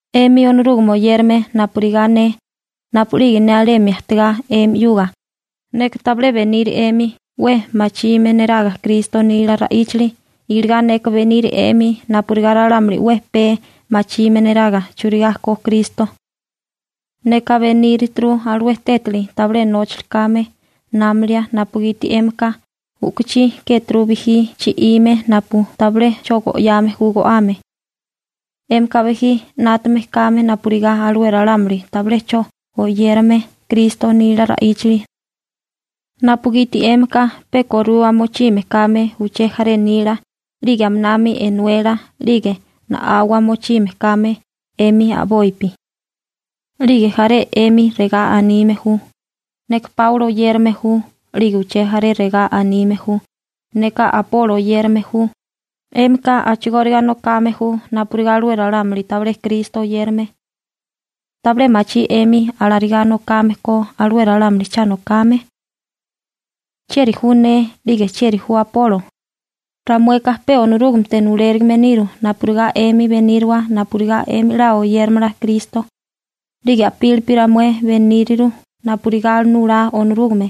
'Emi Onorúgame oyérame napurigá ne, napu'lige ne alemi ajtigá 'emi 'yuga, neka tabilé beniri 'emi 'we machime neraga Kristo nila ra'íchali, iligá neka beniri 'emi napurigá ralámuli 'we pee machime neraga churigá ko Kristo. Neka benírituru alué tétali tabilé nóchali kame námalia, napugiti 'émika u'kuchí kéturu bijí chi'ime napu tabilé 'cho go'yame ju go'ame. 'Émika bijí 'nátame kame napurigá alué ralámuli tabilé 'cho oyérame Kristo nila ra'íchali, napugiti 'émika pe korua mochime kame uché jaré nila 'lige aminami enuela 'lige na'awa mochime kame 'emi a'bopi. 'Lige jaré 'emi regá anime ju: «Neka Páulo oyérame ju», 'lige uché jaré regá anime ju: «Neka Apolo oyérame ju», 'émika a'chigóriga nokame ju napurigá alué ralámuli tabilé Kristo oyérame. ¿Tabilé machí 'emi alarigá nokame ko alué ralámuli cha nokame? ¿Chieri ju ne 'lige chieri ju Apolo? Ramueka pe Onorúgamete nulérigime niru napurigá 'emi beníriwa napurigá 'emi 'la oyéramala Kristo. 'Lige a'pílipi ramué beníriru napurigá nulá Onorúgame.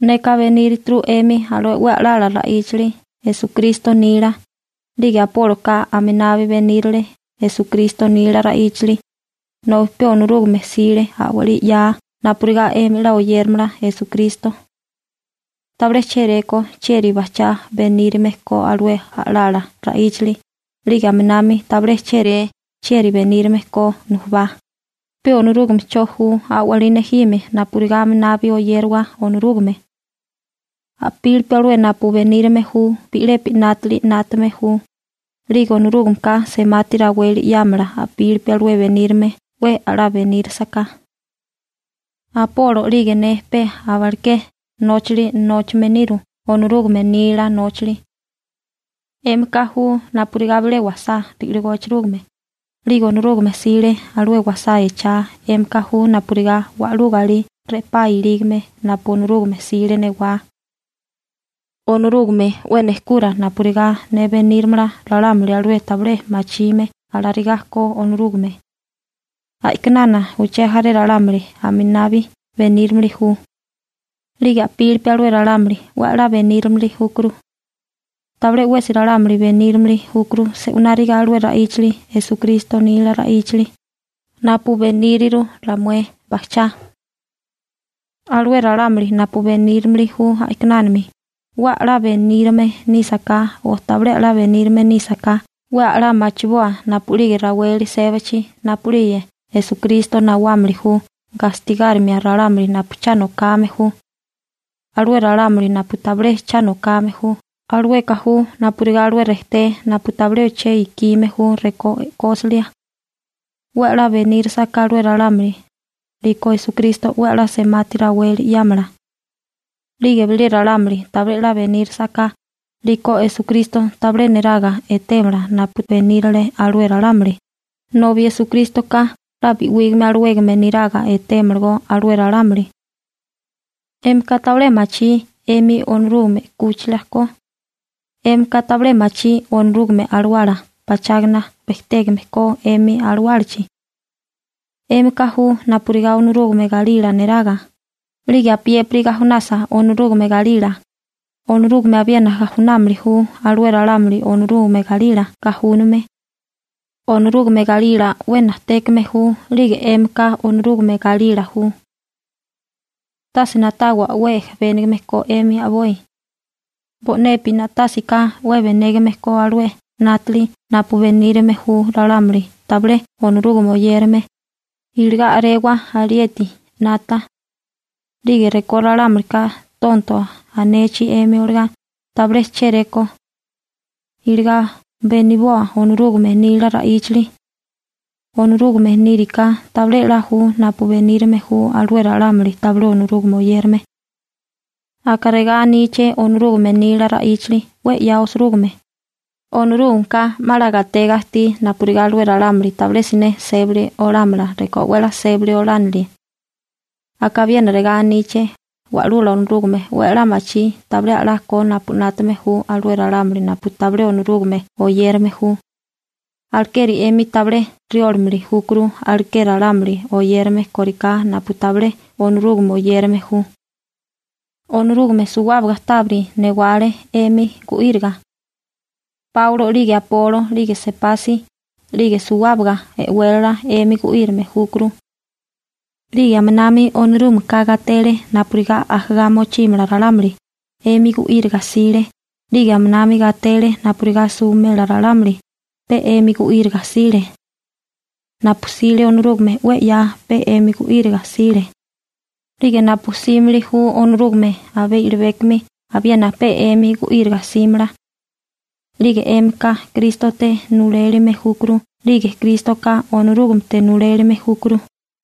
Neka benírituru 'émi alué 'we a'lala ra'íchali Esukristo nila, 'lige Apóloka aminabi benírale Esukristo nila ra'íchali, nobi pe Onorúgame 'sile a'walí 'yaa napurigá 'emi 'la oyéramala Esukristo. Tabilé chéréko chieri bajchá benírame ko alué a'lala ra'íchali 'lige aminami tabilé chéréko chieri benírame ko nujubá, pe Onorúgame 'cho ju a'walí nejime napurigá aminabi oyérawa Onorúgame. A'pílipi alué napu benírime ju bi'lepi 'nátali 'nátame ju, 'lige Onorúgameka semati raweli 'yámala a'pílipi alué benírame 'we 'la benírasaká. Apolo 'lige ne pe abaleké nóchali nóchame niru Onorúgame nila nóchali. 'Émika ju napurigá bile wasá ri'ligó echerúgime, 'lige Onorúgame 'sile alué wasá echá, 'émika ju napurigá wa'lú galí re'pá ilígame napu Onorúgame 'sile newá. Onorúgame 'we nejkura napurigá ne benírimala ralámuli alué tabilé 'me machime alarigá ko Onorúgame. A'kinana uché jaré ralámuli aminabi benírimili ju. 'Lige a'pílipi alué ralámuli 'we 'la benírimili júkuru. Tabilé 'wesi ralámuli benírimili júkuru se'wináriga alué ra'íchali Esukristo nila ra'íchali, napu beníriru ramué bajchá. Alué ralámuli napu benírimili ju a'kinana 'we a'lá benírame nísaká o tabilé 'la benírame nísaká 'we 'la machiboa napu'lige raweli sébachi napu'lige Esukristo nawámili ju gastigárimia ralámuli napu cha nokame ju. Alué ralámuli napu tabilé cha nokame ju, alueka ju napurigá alué rejté napu tabilé che ikime ju rekó e'kósilia. 'We 'la benírisaká alué ralámuli, 'liko Esukristo 'we 'la semati raweli 'yámala. 'Lige bilé ralámuli tabilé 'la benírisaká 'liko Esukristo tabilé niraga etémala napu benírale alué ralámuli, nobi Esukrístoka 'la bi'wígame alawégame niraga etémalagó alué ralámuli. ¿'Émika tabilé machí 'emi Onorúgame 'kúchila ko? ¿'Émika tabilé machí Onorúgame Alawala pachágana bejtégame ko 'emi alawálachi? 'Émika ju napurigá Onorúgame galila neraga, 'lige apiépiri gajunasa Onorúgame galila, Onorúgame abiena gajunámili ju alué ralámuli Onorúgame galila gajúname. Onorúgame galila 'we najtékame ju 'lige 'émika Onorúgame galila ju. Tase na'tawa 'we ejebénigame ko 'emi a'boi. Bo'nepi na'tásiká 'we benégame ko alué 'nátali 'nátaga napu benírame ju ralámuli tabilé Onorúgame oyérame, iligá a'rewa alieti 'nata. 'Lige rekó ralámulika «tonto» anechi 'emi olagá, tabilé chéréko. Iligá beniboa Onorúgame nila ra'íchali. Onorúgame níriká tabilé 'la ju napu benírame ju alué ralámuli tabilé Onorúgame oyérame. Aka regá aníché Onorúgame nila ra'íchali 'we 'ya osirúgime: «Onorúgameka 'ma 'la gatega ajtí napurigá alué ralámuli tabilé siné sébali olámala rekó 'we 'la sébali olánilie.» Aka abiena regá aníché: «Wa'lula Onorúgame 'we a'lá machí tabilé a'lá ko napu 'nátame ju alué ralámuli napu tabilé Onorúgame oyérame ju.» Alekeri 'emi tabilé riólamili júkuru aleké ralámuli oyérame kóriká napu tabilé Onorúgame oyérame ju. Onorúgame suwábaga tábiri newale 'emi gu'íriga. Páulo, 'lige Apolo 'lige Sepasi (Pegro), 'lige suwábaga e'wélala 'emi gu'írame júkuru. 'Lige aminami Onorúgameka gatele napurigá ajagá mochímala ralámuli, 'emi gu'íriga 'sile, 'lige aminami gatele napurigá suwimela ralámuli, pe 'emi gu'íriga 'sile. Napu 'sile Onorúgame 'we 'ya pe 'emi gu'íriga 'sile. 'Lige napu 'símili ju Onorúgame abé i'libékomi abiena pe 'emi gu'íriga 'símala. 'Lige 'émika Krístote nulalime júkuru 'lige Krístoka Onorúgamete nulelime júkuru.